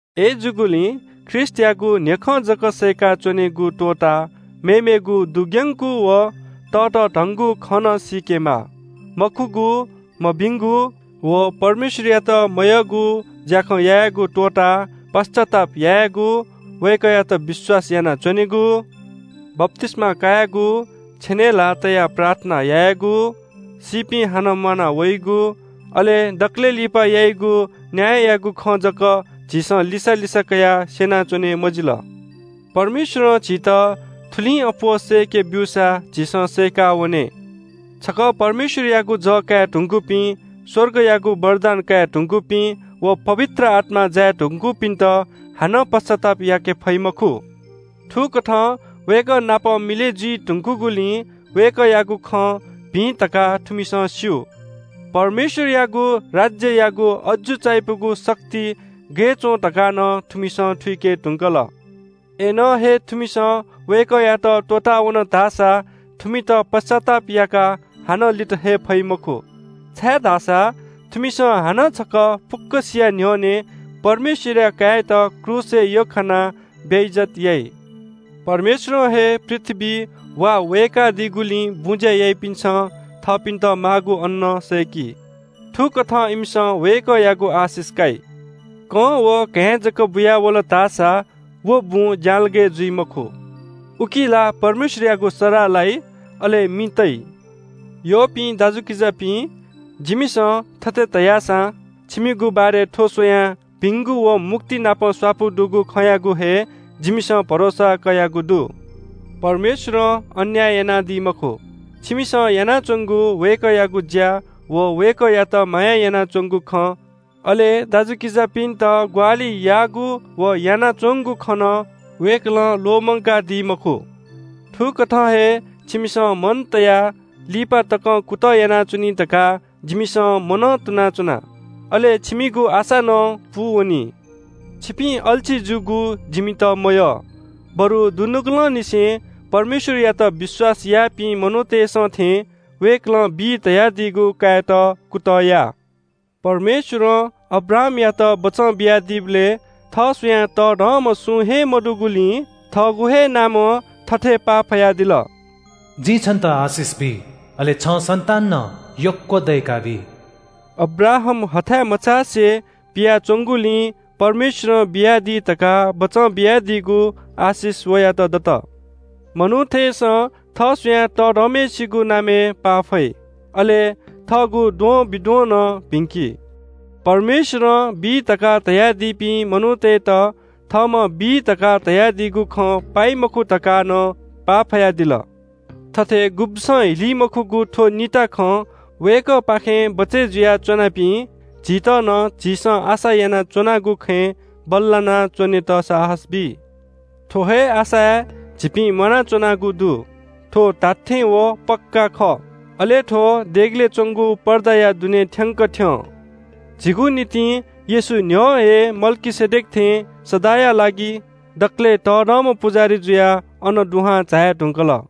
अय्‌जूगुलिं ख्रीष्‍टयागु न्‍ह्यखँ जक सय्‌का च्‍वनेगु त्‍वःताः मेमेगु दुग्‍यंगु व ततःधंगु खँ नं सीकेमाः। मखुगु, मभिंगु व परमेश्‍वरयात मयःगु ज्‍याखँ यायेगु त्‍वःताः पश्‍चाताप यायेगु, वय्‌कःयात विश्‍वास यानाच्‍वनेगु, बप्‍तिस्‍मा कायेगु, छेनय् ल्‍हाः तयाः प्रार्थना यायेगु, सीपिं हानं म्‍वाना वइगु, अले दकलय् लिपा याइगु न्‍याययागु खँ जक झीसं लिसा लिसा कयाः स्‍यनाच्‍वने मजिल। परमेश्‍वरं झीत थुलिं अप्‍वः सय्‌के ब्‍यूसा झीसं सय्‌का वने। छकः परमेश्‍वरयागु जः काये धुंकूपिं, स्‍वर्गयागु वरदान काये धुंकूपिं व पवित्र आत्‍मां जाये धुंकूपिन्‍त हानं पश्‍चाताप याके फइ मखु। थुकथं वय्‌कः नाप मिलय् जुइ धुंकूगुलिं वय्‌कःयागु खँ भिं धकाः थुमिसं स्‍यू। परमेश्‍वरयागु राज्‍ययागु अजू चायापुगु शक्ति गय् च्‍वं धकाः नं थुमिसं थुइके धुंकल। अय्‌नं हे थुमिसं वय्‌कःयात त्‍वःतावन धाःसा थुमित पश्‍चाताप याकाः हानं लित हये फइ मखु। छाय्‌धाःसा थुमिसं हानं छकः फुक्‍कसिया न्‍ह्यःने परमेश्‍वरया काय्‌यात क्रूसय् यख्‍खानाः बेइज्‍जत याइ। परमेश्‍वरं हे पृथ्‍वीइ वा वय्‌कादीगुलिं बुँज्‍या याइपिन्‍सं थःपिन्‍त माःगु अन्‍न सय्‌की। थुकथं इमिसं वय्‌कःयागु आशिष काइ। कं व घाँय् जक बुयावल धाःसा व बुँ ज्‍यालगय् जुइ मखु। उकी ला परमेश्‍वरयागु सराः लाइ, अले मि तइ। यःपिं दाजुकिजापिं, जिमिसं थथे धयासां छिमिगु बारे थ्‍व स्‍वयाः भिंगु व मुक्तिनापं स्‍वापु दुगु खँयागु हे जिमिसं भरोसा कयागु दु। परमेश्‍वरं अन्‍याय यानादी मखु। छिमिसं यानाच्‍वंगु वय्‌कःयागु ज्‍या व वय्‌कःयात माया यानाच्‍वंगु खँ, अले दाजुकिजापिन्‍त ग्‍वाहालि याःगु व यानाच्‍वंगु खँ नं वय्‌कलं ल्‍वःमंकादी मखु। थुकथं हे छिमिसं मन तयाः लिपा तकं कुतः यानाच्‍वनी धकाः जिमिसं मनं तुनाच्‍वना। अले छिमिगु आशा नं पूवनी। छिपिं अल्‍छी जूगु जिमित मयः, बरु दुनुगलंनिसें परमेश्‍वरयात विश्‍वास याःपिं मनूतय्‌सं थें वय्‌कलं बी धयादीगु कायेत कुतः या। परमेश्‍वरं अब्राहामयात बचं बियादीबलय् थः स्‍वयाः तःधंम्‍ह सुं हे मदुगुलिं थःगु हे नामं थथे पाफयादिल – “जिं छन्‍त आशिष बी, अले छं सन्‍तान नं यक्‍व दय्‌काबी।” अब्राहाम हथाय् मचासे पियाच्‍वंगुलिं परमेश्‍वरं बियादी धकाः बचं बियादीगु आशिष वयात दत। मनूतय्‌सं थः स्‍वयाः तःधंम्‍हय्‌सिगु नामय् पा फइ। अले थःगु द्वंबिद्वं नं भिंकी। परमेश्‍वरं बी धकाः धयादीपिं मनूतय्‌त थःम्‍हं बी धकाः धयादीगु खँ पाइ मखु धकाः नं पाफयादिल। थथे गुब्‍सं हिली मखुगु थ्‍व निता खं वय्‌कःपाखें बचय् जुया च्‍वनापिं झीत नं झीसं आशा यानाच्‍वनागु खँय् बल्‍लाना च्‍वनेत साहस बी। थ्‍व हे आशाय् झीपिं म्‍वानाच्‍वनागु दु। थ्‍व धात्‍थें व पक्‍का खः। अले थ्‍व देगलय् च्‍वंगु पर्दाया दुने थ्‍यंकः थ्‍यं। झीगु निंतिं येशू न्‍ह्यः हे मल्‍कीसेदेक थें सदांया लागि दकलय् तःधंम्‍ह पुजाहारी जुयाः अन दुहां झाये धुंकल।